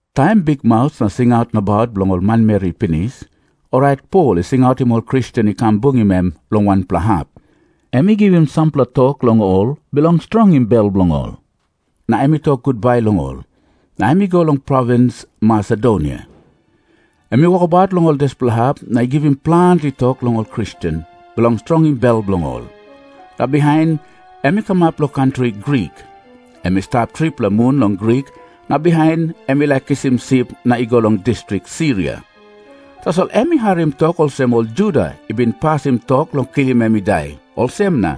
Taim bikmaus na singaut nabaut bilong ol manmeri i pinis, orait Pol i singautim ol Kristen i kam bungim em long wanpela hap. Em i givim sampela tok long ol bilong strongim bel bilong ol, na em i tok gutbai long ol, na em i go long provins Masedonia. Em i wokabaut long ol dispela hap na i givim planti tok long ol Kristen, bilong strongim bel bilong ol. Na bihain em i kamap long kantri Grik. Em i stap tripela mun long Grik na bihain em i laik kisim sip na i go long distrik Siria. Tasol em i harim tok olsem ol Juda i bin pasim tok long kilim em i dai, olsem na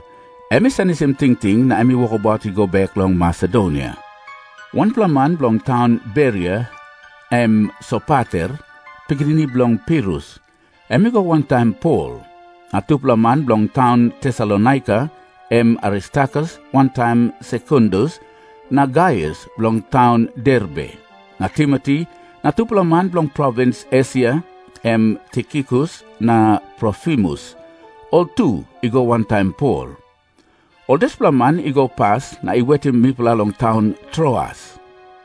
em i senisim tingting na em i wokabaut i go bek long Masedonia. Wanpela man bilong taun Beria, em Sopater, pikinini bilong Pirus, em i go wantaim Pol. Na tupela man bilong taun Tesalonaika, em Aristarkus wantaim Sekundus, na Gaius bilong taun Derbe, na Timoti, na tupela man bilong provins Esia, em Tikikus na Trofimus, ol tu i go wantaim Pol. Ol dispela man i go pas na i wetim mipela long taun Troas.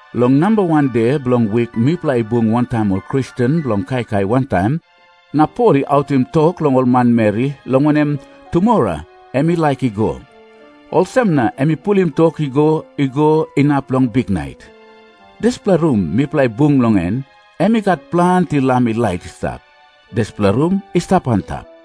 Long namba wan de bilong wik mipela i bung wantaim ol Kristen bilong kaikai wantaim. Na Pol i autim tok long ol manmeri, long wanem, tumora em i laik i go. Olsem na em i pulim tok i go i go inap long biknait. Dispela rum mipela i bung long en, em i gat planti lam i lait i stap. Dispela rum i stap antap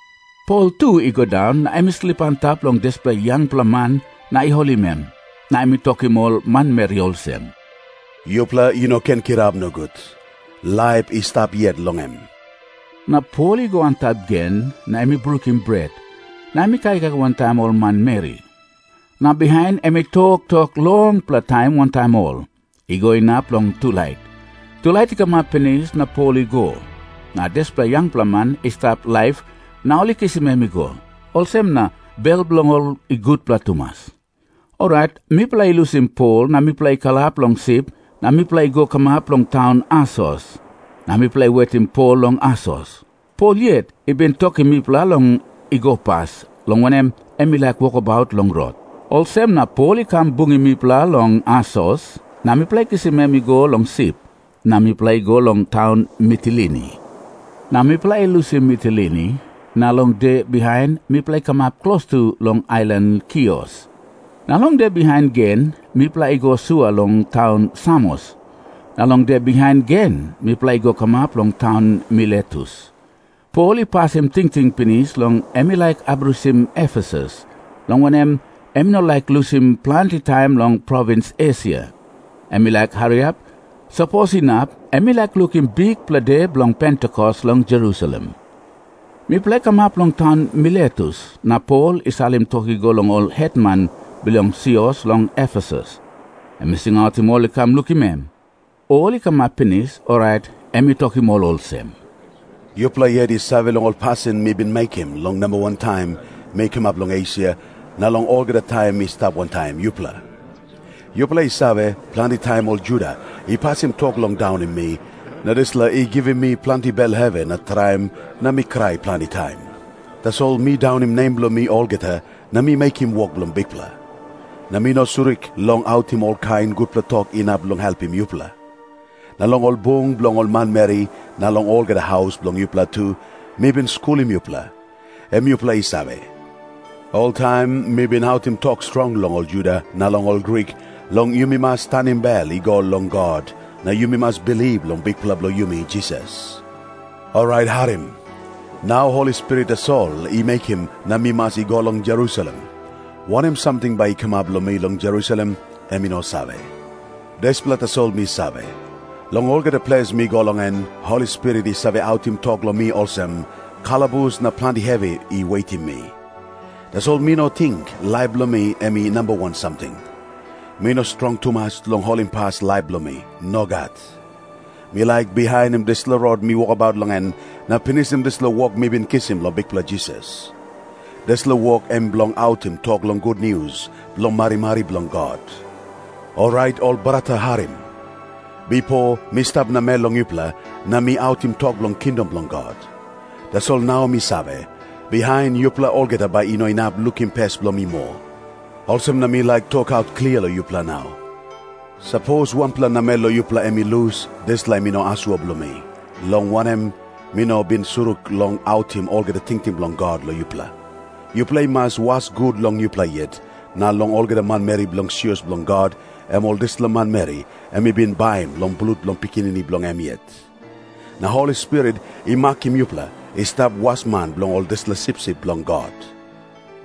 Pol tu i go daun, na em i slip antap long dispela yangpela man na i holim em. Na em i tokim ol manmeri olsem, "Yupela i no ken kirap nogut. Laip i stap yet long em." Na Pol i go antap gen, na em i brukim bret, na em i kaikai wantaim ol manmeri. Na bihain em i toktok longpela taim wantaim ol, i go inap long tulait. Tulait i kamap pinis na Pol i go. Na dispela yangpela man i stap laip na ol i kisim em i go. Olsem na bel bilong ol i gutpela tumas. Orait mipela i lusim Pol na mipela i kalap long sip na mipela i go kamap long taun Asos. Na mipela i wetim Pol long Asos. Pol yet i bin tokim mipela long i go pas, long wanem, em i laik wokabaut long rot. Olsem na Pol i kam bungim mipela long Asos, na mipela i kisim em i go long sip, na mipela i go long taun Mitilini. Na mipela i lusim Mitilini, na long de bihain mipela i kamap klostu long ailan Kios. Na long de bihain gen mipela i go sua long taun Samos. Na long de bihain gen mipela i go kamap long taun Miletus. Pol i pasim tingting pinis long em i laik abrusim Efesus, long wanem, em i no laik lusim planti taim long provins Esia. Em i laik hariap. Sapos inap, em i laik lukim Bikpela De Bilong Pentikos long Jerusalem. Mipela i kamap long taun Miletus na Pol i salim tok i go long ol hetman bilong sios long Efesus. Em i singautim ol i kam lukim em. Ol i kamap pinis, orait em i tokim ol olsem, "Yupela yet i save long ol pasin mi bin mekim long namba wan taim mi kamap long Esia, na long olgeta taim mi stap wantaim yupela. Yupela i save, planti taim ol Juda i pasim tok long daunim mi, na dispela i givim mi planti bel hevi na traim na mi krai planti taim. Tasol mi daunim nem bilong mi olgeta, na mi mekim wok bilong Bikpela. Na mi no surik long autim olkain gutpela tok inap long helpim yupela. Na long ol bung bilong ol manmeri na long olgeta haus bilong yupela tu, mi bin skulim yupela. Em yupela i save. Oltaim mi bin autim tok strong long ol Juda na long ol Grik, long yumi mas tanim bel i go long God, na yumi mas bilip long Bikpela bilong yumi Jisas. Orait harim. Nau Holi Spirit tasol i mekim na mi mas i go long Jerusalem. Wanem samting bai i kamap long mi long Jerusalem, em mi no save. Dispela tasol mi save. Long olgeta ples mi go long en, Holi Spirit i save autim tok long mi olsem, kalabus na planti hevi i wetim mi. "Tasol mi no ting laip bilong mi em i namba wan samting. Mi no strong tumas long holimpas laip bilong mi. Nogat. Mi laik bihainim dispela rot mi wokabaut long en na pinisim dispela wok mi bin kisim long Bikpela Jisas. Dispela wok em bilong autim tok long gutnius bilong marimari bilong God. "Orait ol brata, harim. Bipo mi stap namel long yupela, na mi autim tok bilong kingdom bilong God. Tasol nau mi save, bihain yupela olgeta bai i no inap lukim pes bilong mi moa. Olsem na mi laik tokaut klia long yupela nau. Sapos wanpela namel long yupela em i lus, dispela em i no asua bilong mi, long wanem, mi no bin surik long autim olgeta tingting bilong God long yupela. Yupela i mas was gut long yupela yet, na long olgeta manmeri bilong sios bilong God, em ol dispela manmeri em i bin baim long blut bilong Pikinini bilong em yet. Na Holi Spirit i makim yupela i stap wasman bilong ol dispela sipsip bilong God.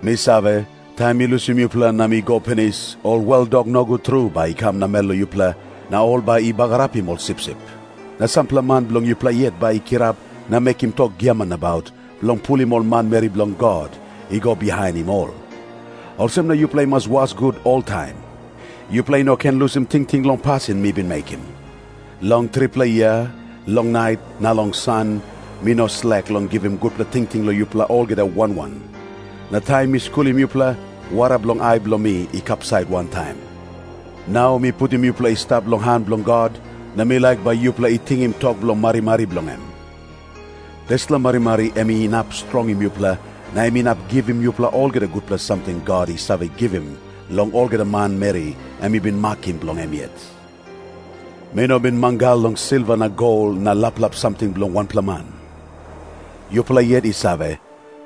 Mi save, taim mi lusim yupela na mi go pinis, ol weldok nogut tru bai i kam namel long yupela, na ol bai i bagarapim ol sipsip. Na sampela man bilong yupela yet bai i kirap na mekim tok giaman nabaut, bilong pulim ol manmeri bilong God i go bihainim ol. Olsem na yupela i mas was gut oltaim. Yupela i no ken lusim tingting long pasin mi bin mekim. Long tripela yia, long nait na long san, mi no slek long givim gutpela tingting long yupela olgeta wan wan. Na taim mi skulim yupela, wara bilong ai bilong mi i kapsait wantaim. "Nau mi putim yupela i stap long han bilong God, na mi laik bai yupela i tingim tok bilong marimari bilong em. Dispela marimari em inap strongim yupela, na em inap givim yupela olgeta gutpela samting God i save givim long olgeta manmeri em i bin makim bilong em yet. "Mi no bin mangal long silva na gol na laplap samting bilong wanpela man. Yupela yet i save,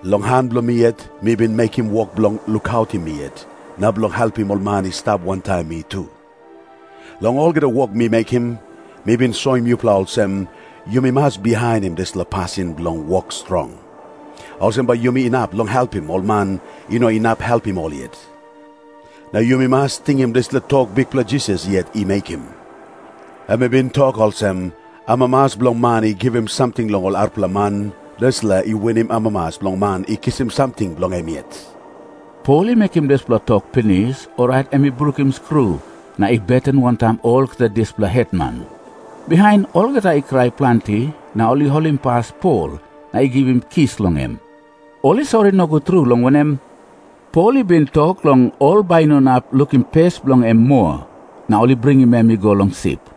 long han bilong mi yet mi bin mekim wok bilong lukautim mi yet, na bilong helpim ol man i stap wantaim mi tu. Long olgeta wok mi mekim, mi bin soim yupela olsem, yumi mas bihainim dispela pasin bilong wok strong. Olsem bai yumi inap long helpim ol man i no inap helpim ol yet. Na yumi mas tingim dispela tok Bikpela Jisas yet i mekim. Em i bin tok olsem, 'Amamas bilong man i givim samting long ol arapela man, dispela i winim amamas bilong man i kisim samting bilong em yet.' " Pol i mekim dispela tok pinis, orait em i brukim skru na i beten wantaim olgeta dispela hetman. Bihain olgeta i krai planti, na ol i holimpas Pol na i givim kis long em. Ol i sori nogut tru, long wanem, Pol i bin tok long ol bai i no inap lukim pes bilong en moa. Na ol i bringim em i go long sip.